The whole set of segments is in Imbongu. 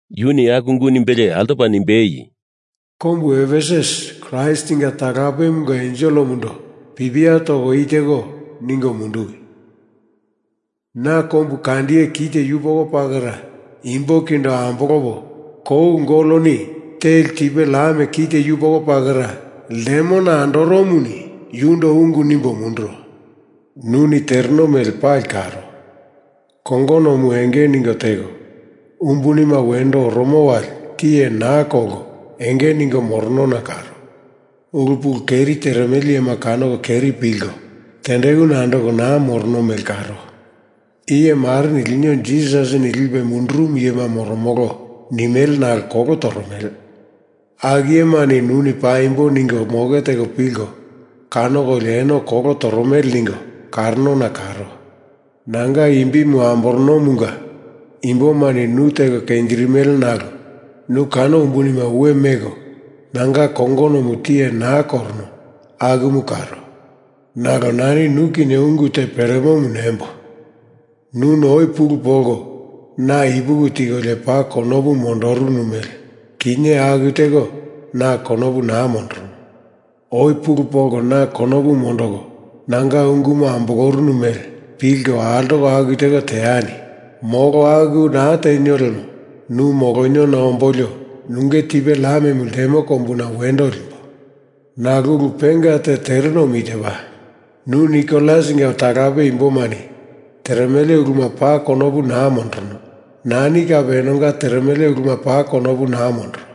Yuni aku ungu nimbelie altopa nimbei, “Kombu Efesus Kraistinga talapemunga enselemundo pipia toko i teko ningo munduwi. Na kombukandiye kite yupoko pakera imbo kindo ambolopo kou goloni teli tipe lam kite yupoko pakera ltemona andoromuni yundo ungu nimbo munduro. Nuni tereno mele pali karo. Kongonomu enge ningo teko, umbunima wendo oromo wali tiye naa kolko enge ningo moronona karo. Ulu pulu keri teremele iyema kanoko keri pilko tendekuna andoko naa morono mele karo. Iye mareni, ‘Lino Jisasini lipe mundurumu iyema moromolo,’ nimele nalo kolo toromele. Aku iyema nuni paimbonje ningo moke teko pilko kanokolio eno kolo toromele ningo karonona karo. Nanga imbimu amboronomunga imbomani nu teko kenjirimele nalo nu kano umbunima we meko nanga kongonomu tiye naa korono akumu karo. Nalo nani nu kinye ungu te peremomu nembo: Nuni oi pulu polko na ipuki tikolio paa konopu mondorunu mele kinye aku teko na konopu naa mondorono. Oi pulu polko na konopu mondoko nanga ungumu ambolorunu mele pilko altoko aku teko teani! Molo aku naa tenio lemo nu moloniona ombolio nunge tipe lamemu ltemo kombuna wendo limbo. Nalo ulu penga te terenomu itepa: Nu Nikolasinga talape imbomani teremele uluma paa konopu naa mondorono. Nani kape enonga teremele uluma paa konopu naa mondoro.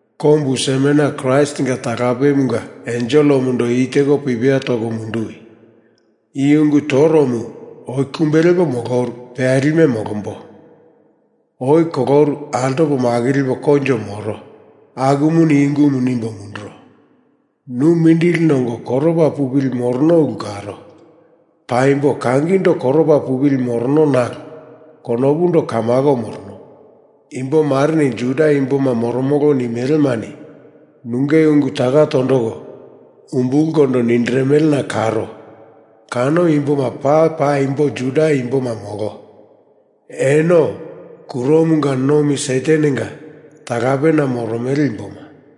“Kombu Smerna Kraistinga talapemunga enselemundo i teko pipia toko munduwi. I ungu toromu oi kumbe lepo moloru peyalime molombo. Oi koloru altopo makilipo koinjo moro akumuni i ungumu nimbo munduro. Nu mindili nongo koropa pupili morono ulu karo. (Paimbo kangindo koropa pupili morono nalo konopundo kamako morono.) Imbo mareni Juda imboma moromolo. nimelemani nunge ungu taka tondoko umbulkondo nindirimelena karo, Kano imboma paa paimbo Juda imboma molo. Eno kuromanga nomi Satanenga talapena moromele imboma.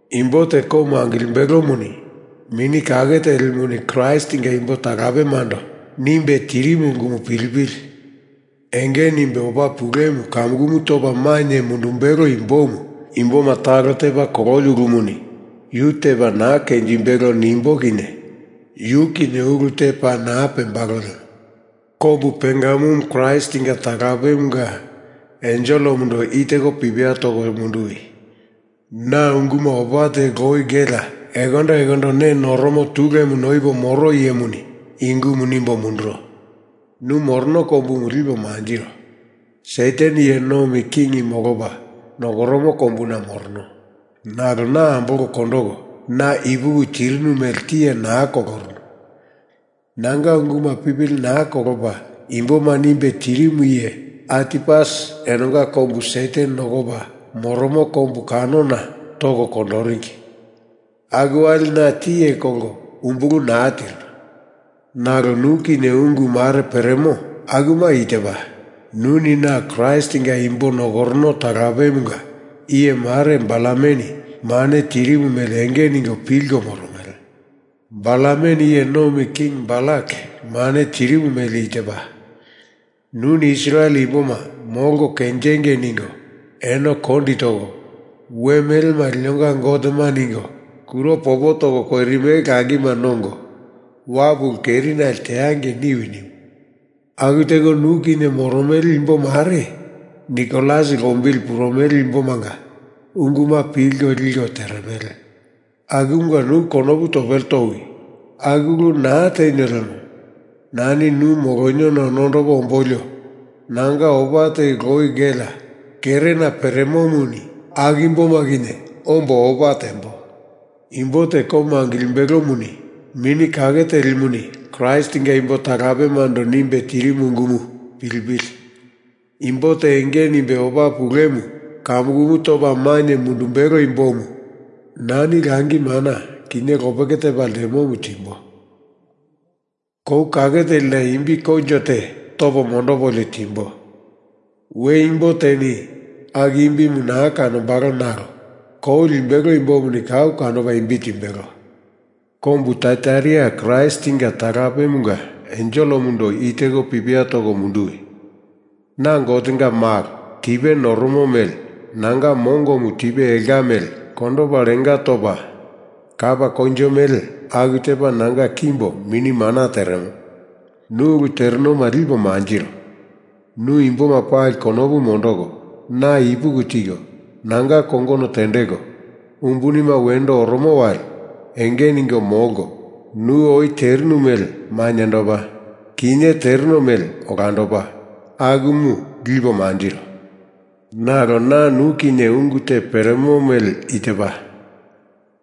Imbo te komu angilimbelomuni Mini Kake Telimuni Kraistinga imbo talapemando nimbe tirimu ungumu pilipili! Enge nimbe opa pulemu kamukumu topa mainye mundumbelo imbomu imboma talo tepa kololi ulumuni yu tepa naa kenjimbelo nimbo kinye yu kinye ulu te paa naa pembalo lemo.” “Kombu Pergamum Kraistinga talapemunga enselemundo i teko pipia toko munduwi. Na unguma opa teli loi gelea ekondo ekondo ne noromo tulemu noipo moro iyemuni i ungumu nimbo munduro. Nu morono kombumu lipo mantiro. Satan iye nomi king molopa nokoromo kombuna morono. Nalo na ambolko kondoko, na ipuki tirinu mele tiye naa kolorunu. Nanga unguma pipili naa kolopa imboma nimbe tirimu iye Antipas enonga kombu Satan nokopa moromo kombu kanona toko kondoringi. Aku wali na tiye kolko umbulu naa tirinu. Nalo nu kinye ungu mare peremo, akuma i tepa. Nuni na Kraistinga imbo nokorono talapemunga iye mare Balameni mane tirimu mele enge ningo pilko moromele. Balameni iye nomi king Balak mane tirimu mele i tepa. Nuni Israel imboma molko kenjengei ningo eno kondi toko, we melema linonga gotema ningo kuro popo toko koirimele langima nongo, wapu ulu kerinali teangei niwi nimu. Aku teko nu kinye moromele imbo mare Nikolas lombili purumele imbomanga unguma pilko liko teremele. Akumunga nu konopu topele towi! Aku ulu naa tenio lemo nani nu moloniona nondopo ombolio nanga opa teli loi gelea kerena peremomuni aku imboma kinye ombo opa tembo. Imbo te komu angilimbelomuni Mini Kake Telimuni Kraistinga imbo talapemando nimbe tirimu ungumu pilipili! Imbo te enge nimbe opa pulemu kamukumu topa mainye mundumbelo imbomu na langi mana, kinye lopeke tepa ltemomu timbo. Kou kake telina imbi koinjo te topo mondopolio timbo. We imbo teni aku imbimu naa kanombalo nalo kou limbelo imbomuni kau kanopa imbi timbelo.” “Kombu Taiataira Kraistinga talapemunga enselemundo i teko pipia toko munduwi. Na Gotenga Malo, tipe noromo mele nanga mongomu tipe elka mele kondopa lenga topa, kapa koinjo mele aku tepa nanga kimbo mini mana teremo. Nu ulu terenoma lipo manjiro. Nu imboma pali konopu mondoko, na ipuki tiko, nanga kongono tendeko, umbunima wendo oromo wali enge ningo molko, nu oi terinu mele mainyendopa, kinye tereno mele olandopa, akumu lipo manjiro. Nalo na nu kinye ungu te peremo mele i tepa.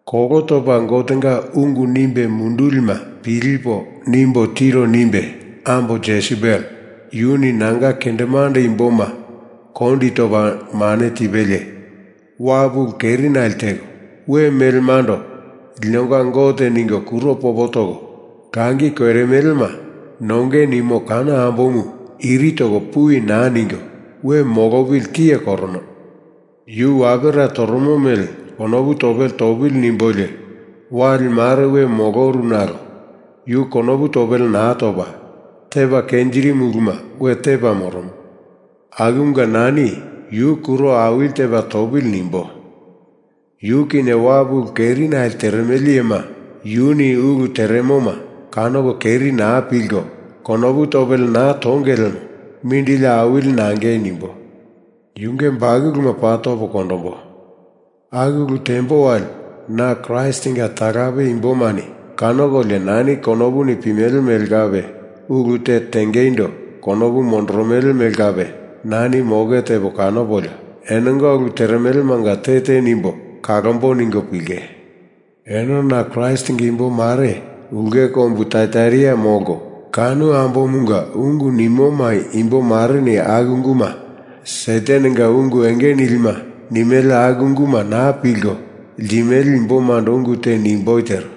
Kolo topa Gotenga ungu nimbe mundulima pilipo nimbo tiro nimbe ambo Jesebel, yuni nanga kendemande imboma kondi topa mane tipelie, wapu ulu kerinale teko, we melemando linonga gote ningo kuro popo toko langi koirimelema nonge nimo kano ambomu iri toko puwi naa ningo we molopili tiye korono. Yu wapera toromo mele konopu topele topili nimbolio, wali mare we moloru nalo yu konopu topele naa topa, tepa kenjirimu uluma we tepa moromo. Akumunga nani Yu kuro awili tepa topili nimbo. Yu kinye wapu ulu kerinale teremele iyema yuni ulu teremoma kanoko keri naa pilko konopu topele naa tonge lemo mindili awili nangei nimbo. Yunge bakuluma paa topo kondombo. Aku ulu tembo wali na Kraistinga talape imbomani kanokolio, nani konopuni pimele mele kape ulu te tengeindo konopu mondoromele mele kape nani moke tepo kanopolio, enonga ulu teremelemanga te te nimbe kalombo ningo pilinge. Eno na Kraistinga imbo mare ulke kombu Taiataira molko, kano ambomunga ungu nimoma imbo mareni aku unguma Satanenga ungu enge nilima nimele aku unguma naa pilko ltimele imbomando ungu te nimboi tero.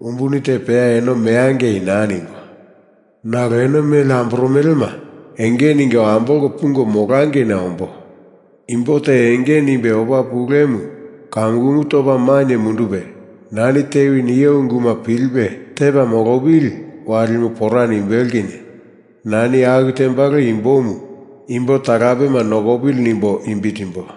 Umbuni te peya eno meangei naa nimbo. Nalo eno mele amboromelema enge ningo ambolko pungo molangeina ombo! Imbo te enge nimbe opa pulemu kamukumu topa mainye mundupe, nani tewi nio unguma pilipe tepa molopili, walimu pora nimbelo kinye nani aku tembalo imbomu imbo talapema nokopili nimbo imbi timbo.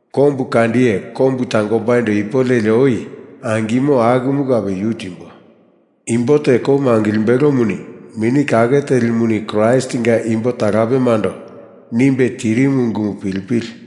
Kombu kandiye kombu tangombaindo ipu leli oi angimo akumu kape yu timbo. Imbo te komu angilimbelomuni Mini Kake Telimuni Kraistinga imbo talapemando nimbe tirimu ungumu pilipili!”